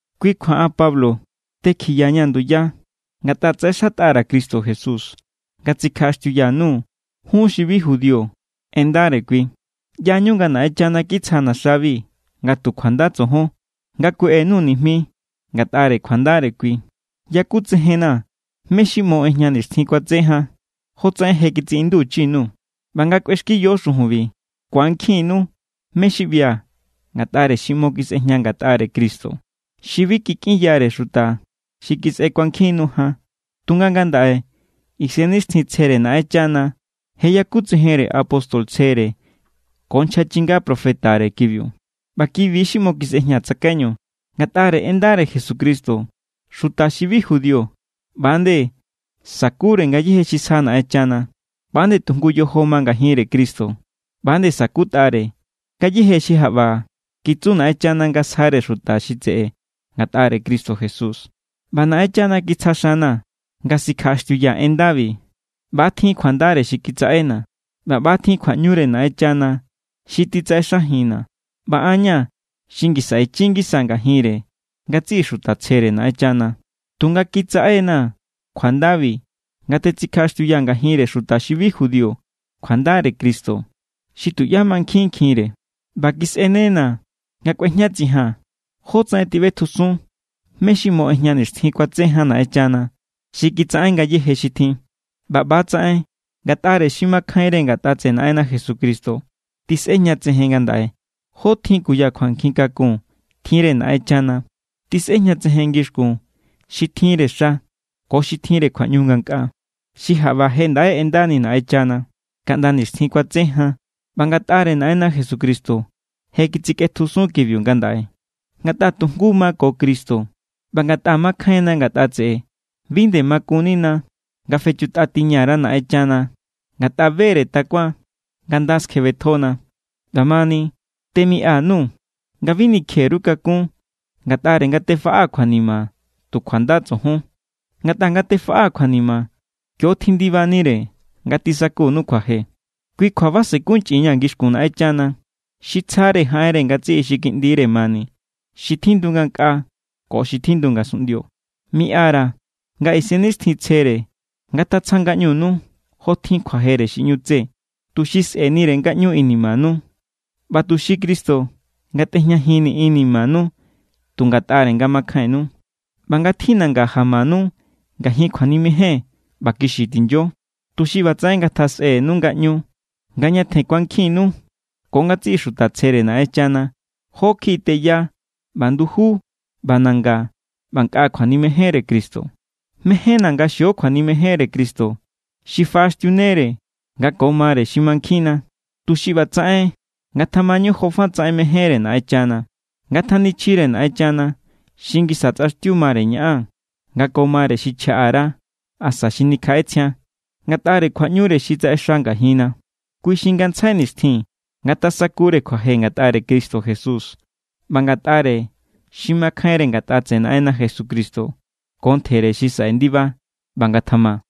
Kui kjua an Pablo tekjiyaña̱ nduya ngatꞌa tsaꞌexatꞌa_ra̱ Cristo Jesús nga tsikjaꞌaxtiuya_nuu̱ jun xi bi judío en ndare kui. ꞌYañu nga Naꞌenchana kitsjana̱ xabi nga tu kjuanda tsojon, nga kueꞌe_nuu̱ nijmi ngatꞌare kjuandare kui. Yakutsejen=na̱ mé= xi ꞌmo ꞌejña nixtjin kuatse jan, jotsaꞌen je kitsiꞌinduchi_nuu̱. ꞌBa nga kꞌuexkiyo xujunbi, ku̱ankjinnu mé= xi ꞌbia̱ ngatꞌare xi ꞌmo kisꞌejña ngatꞌare Cristo. Xi bi kikꞌinyare xuta xi kisꞌe kuankjin nu jan. Tunga ngandaꞌe Isennixtjintsjere Naꞌenchana je yakutsejenre apóstol tsjere ko nchja chinga profetare kibiu. ꞌBa kibi= xi ꞌmo kisꞌejña tsakaiñu: ngatꞌare en ndare Jesucristo xuta xi bi judío ꞌba=nde sa̱kure ngayéje xi sja Naꞌenchana, ꞌba nde tu jngu yojo ma ngajinre Cristo, ꞌba nde sa̱kutꞌare ngayéje xi jaꞌba kitsu Naꞌenchana nga sjare xuta xi tseꞌe ngatꞌare Cristo Jesús. ꞌBa Naꞌenchana kitsja xana̱ nga sikjaꞌaxtiuyaa̱ en ndabi. ꞌBa tjin kjuandare Naꞌenchana xi kitsaꞌena̱, ꞌba ꞌba tjin kjuaꞌñure Naꞌenchana xi titsaꞌexajinna̱. ꞌBa an= ña̱ xi ngisa ichi ngisa ngajinre ngatsiꞌi xuta tsjere Naꞌenchana. Tunga kitsaꞌe=na̱ kjuandabi nga tetsikjaꞌaxtiuyaa̱ ngajinre xuta xi bi judío kjuandare Cristo xi tuꞌyá mankjinkjinkjinre. ꞌBa kisꞌenena̱ nga kꞌuejñatsijaa̱n jótsaꞌen tiꞌbetjusun mé= xi ꞌmo ꞌejña nixtjin kuatse jan Naꞌenchana xi kitsaꞌen ngayéje xi tjin. ꞌBa ꞌbatsaꞌen ngatꞌare xi makjainre ngatꞌa tseꞌe Naꞌenna Jesucristo tisꞌejñatsejen ngandaꞌe jó tjin kuya kjuankjin kakun tjinre Naꞌenchana. Tisꞌejñatsejen ngixkun xi tjinre xa ko xi tjinre kjuaꞌñu ngankꞌaa. Xi jaꞌba je ndaꞌe ꞌendani Naꞌenchana kaꞌnda nixtjin kuatse jan ꞌba ngatꞌare Naꞌenna Jesucristo je kitsikꞌetjusun kibiu ngandaꞌe. Ngatꞌa tu jngu ma ko Cristo ꞌba ngatꞌa makjainna ngatꞌa tseꞌe, bi nde makunnina nga fechutꞌatiña_ra Naꞌenchana ngatꞌa be=re takuan nga nda skjebetjona. ꞌBamani, temiꞌa_nuu̱ nga bi nikje_ru kakún ngatꞌare nga tefaꞌaa̱ kjuanima tu kjuanda tsojon. Ngatꞌa nga tefaꞌaa̱ kjuanima, kio= tjindibanire nga tisakunu kjuaje. Kui= kjua basenkunchꞌinñaa̱ ngixkun Naꞌenchana. Xi tsjare jaꞌenre ngatsiꞌi xi kiꞌndire mani, xi tjindu ngankꞌaa ko xi tjindu ngasunꞌndio. Miꞌa_ra̱ nga Isennixtjintsjere ngatatsja ngaꞌñunu jo tjin kjuajere xi ꞌñu tse, tuxi sꞌe̱nire ngaꞌñu inimanu, ꞌba tuxi Cristo ngatꞌejñajinni inimanu tu ngatꞌare nga makjainnu. ꞌBa ngatjinanga jamanu ngajin kjuanimejen ꞌba kixi tinyo, tuxi ꞌbatsaꞌen ngatjasꞌenu ngaꞌñu nga ñatjen ku̱ankjinnu ko ngatsiꞌi xuta tsjere Naꞌenchana jó kjiꞌi teya ꞌba nduju ꞌba nanga ꞌba nkꞌa kjuanimejenre Cristo. Mejénna̱ nga xio kjuanimejenre Cristo, xi faꞌaxtiunere nga ko mare xi mankjinna, tuxi ꞌbatsaꞌen ngatjamañu jofatsaꞌen mejénre Naꞌenchana. Ngatanichjire Naꞌenchana xi ngisa tsꞌaxtiu mare ñaꞌan nga ko mare xi chjaꞌa_ra asa xi nikjaꞌetsjian, ngatꞌare kjuaꞌñure xi tsaꞌexa ngajinna. Kui xi ngantsjai nixtjin ngatasakure kjuaje ngatꞌare Cristo Jesús ꞌba ngatꞌare xi makjainre ngatꞌa tseꞌe Naꞌenna Jesucristo ko ntjere xi saꞌe ndiba. ꞌBa ngatjama.